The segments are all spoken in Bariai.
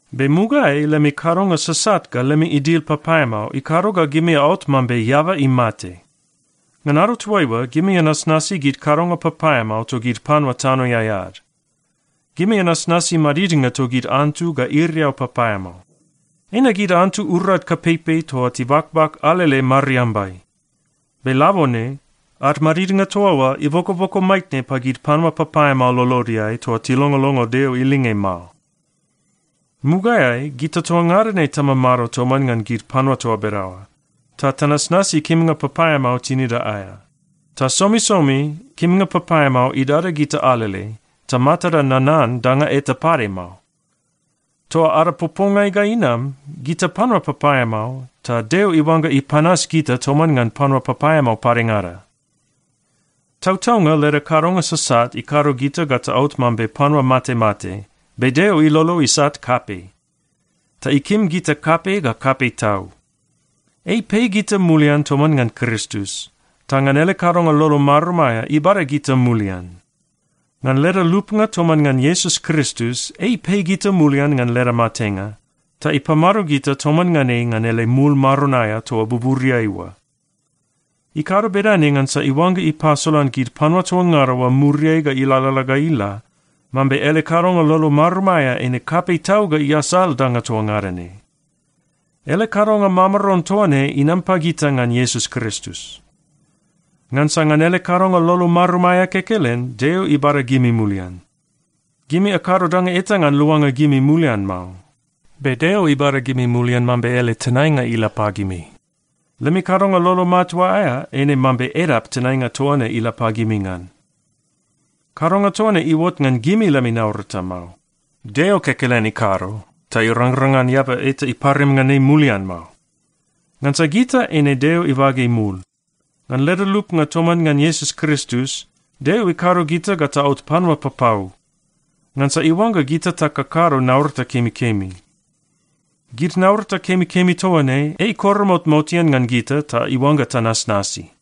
Be mugaeai lemi kadonga sasat ga lemi idil papaeamao ikado ga gimi aot mambe eaba imate. Ngan ado toaiua, gimi anasnasi gid kadonga papaeamao togid panua tanoeai ad. Gimi anasnasi madidnga togid antu ga iriau papaeamao. Eina gid antu urad kapeipei toa tibakbak alele mariambai. Be labone, ad madidnga toa oa ibokoboko maitne pagid panua papaeamao lolodeai toa tilongolongo Deo ilinge mao. Mugaeai gita toa ngada ne tamamado toman ngan gid panua toa bedaoa, ta tanasnasi kimnga papaeamao tinida aea. Ta somisomi kimnga papaeamao idada gita alele, ta matada nanan danga eta pade mao. Toa ada popongai ga inam, gita panua papaeamao, ta Deo iuangga ipanas gita toman ngan panua papaeamao padengada. Tautaunga leda kadonga sasat ikado gita ga taot mambe panua matemate, be Deo ilolo isat kapei, ta ikim gita kapei ga kapei tau. Ei ipei gita mulian toman ngan Kristus. Ta ngan ele kadonga lolo marum aea, ibada gita mulian. Ngan leda lupnga toman ngan Iesus Kristus, ei ipei gita mulian ngan leda matenga, ta ipamado gita toman ngan ei ngan ele mul maron aea toa buburiai oa. Ikado bedane ngansa iuangga ipasolan gid panua toa ngada oa muriai ga ilalala ga ila, mambe ele kadonga lolo marum aea eine kapei tau ga iasal danga toa ngada ne. Ele kadonga mamaron toa ne inam pagita ngan Iesus Kristus. Ngansa ngan ele kadonga lolo marum aea kekelen, Deo ibada gimi mulian. Gimi akado danga eta ngan luanga gimi mulian mao, be Deo ibada gimi mulian mambe ele tenainga ila pagimi. Lemi kadonga lolo matua aea eine mambe edap tenainga toa ne ila pagimi ngan. Kadonga toa ne iuot ngan gimi lemi naurata mao. Deo kekelen ikado, ta irangrang ngan eaba eta iparim ngan ei mulian mao. Ngansa gita eine Deo ibage mul. Ngan leda lupnga toman ngan Iesus Kristus, Deo ikado gita ga taot panua papau, ngansa iuangga gita takakado naurata kemikemi. Gid naurata kemikemi toa ne, ei ikoromot motean ngan gita ta iuangga tanasnasi.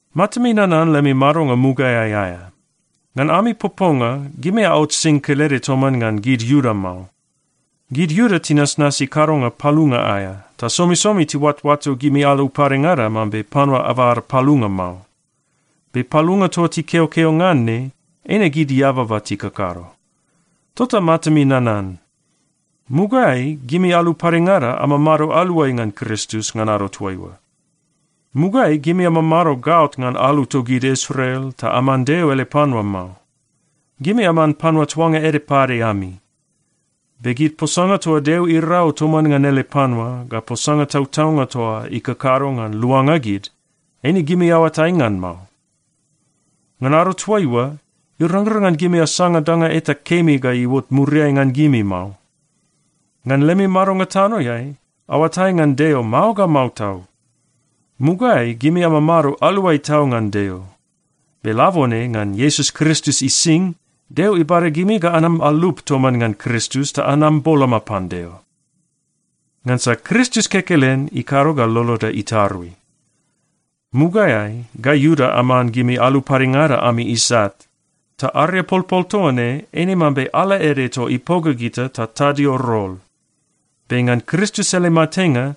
Matami nanan lemi madonga mugaeai aea. Ngan ami poponga, gimi aot sing kelede toman ngan gid Iuda mao. Gid Iuda tinasnasi kadonga palunga aea, ta somisomi tiuatoato gimi alu padengada mambe panua abada palunga mao. Be palunga toa tikeokeo ngan ne, eine gid eababa tikakado. Tota matami nanan, mugaeai gimi alu padengada amamado aluai ngan Kristus ngan ado toaiua. Mugaeai gimi amamado gaot ngan alu togid Israel ta aman Deo ele panua mao. Gimi aman panua tuanga ede pade ami. Be gid posanga toa Deo irau toman ngan ele panua, ga posanga tautaunga toa ikakado ngan luanga gid, eine gimi aoatai ngan mao. Ngan ado toaiua, irangrang ngan gimi asanga danga eta kemi ga iuot muriai ngan gimi mao. Ngan lemi madonga tanoeai, aoatai ngan Deo mao ga mao tau. Mugaeai gimi amamado aluai tau ngan Deo. Be labone ngan Iesus Kristus ising, Deo ibada gimi ga anam alup toman ngan Kristus ta anam boloma pan Deo. Ngansa Kristus kekelen ikado ga loloda itarui. Mugaeai gai Iuda aman gimi alu padengada ami isat, ta ariapolpol toa ne eine mambe ala ede toa ipoga gita ta tadio rol. Be ngan Kristus ele matenga,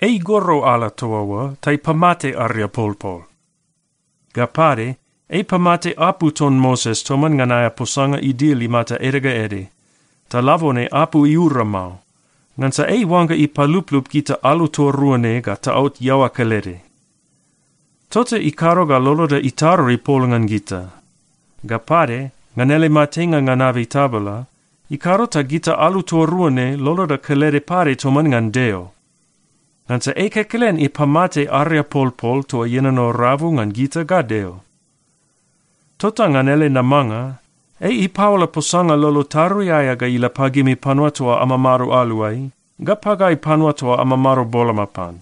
ei igoro ala toa oa ta ipamate ariapolpol. Ga pade, ei ipamate apu ton Moses toman ngan aea posanga idil imata ede ga ede, ta labone apu iura mao, ngansa ei iuangga ipaluplup gita alu toa rua ne ga taot iaoa kelede. Tota ikado ga loloda itarui pol ngan gita. Ga pade, ngan ele matenga ngan abei tabala, ikado ta gita alu toa rua ne loloda kelede pade toman ngan Deo, ngansa ei kekelen ipamate ariapolpol toa ienono rabu ngan gita ga Deo. Tota ngan ele namanga, ei ipaola posanga lolo tarui aea ga ila pagimi panua toa amamado aluai, ga pagai panua toa amamado boloma pan.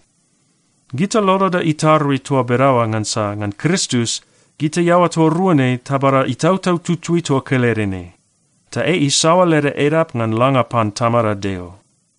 Gita loloda itarui toa bedaoa ngansa ngan Kristus, gita iaoa toa rua ne tabada Itautau Tutui toa kelede ne. Ta ei isaoa leda edap ngan langa pan Tamada Deo.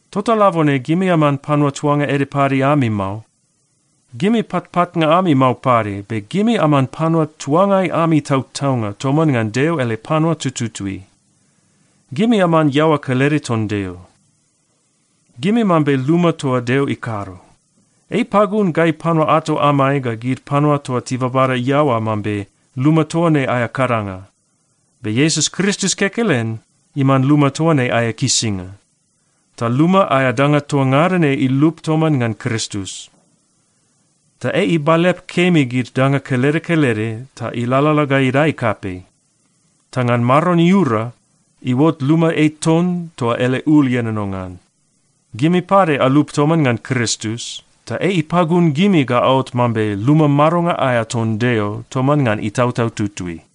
Tota labone gimi aman panua tuanga ede pade ami mao. Gimi patpatnga ami mao pade, be gimi aman panua tuangai ami tautaunga toman ngan Deo ele panua tututui. Gimi aman iaoa kelede ton Deo. Gimi mambe luma toa Deo ikado. Ei ipagun gai panua ato amai ga gid panua toa tibabada iaoa mambe luma toa ne aea kadanga. Be Iesus Kristus kekelen iman luma toa ne aea kisinga. Ta luma aea danga toa ngada ne ilup toman ngan Kristus. Ta ei ibalep kemi gid danga kelede kelede ta ilalala ga idae kapei. Ta ngan Maron iura, iuot luma ei ton toa ele ul ienono ngan. Gimi pade alup toman ngan Kristus, ta ei ipagun gimi ga aot mambe luma madonga aea ton Deo toman ngan Itautau Tutui.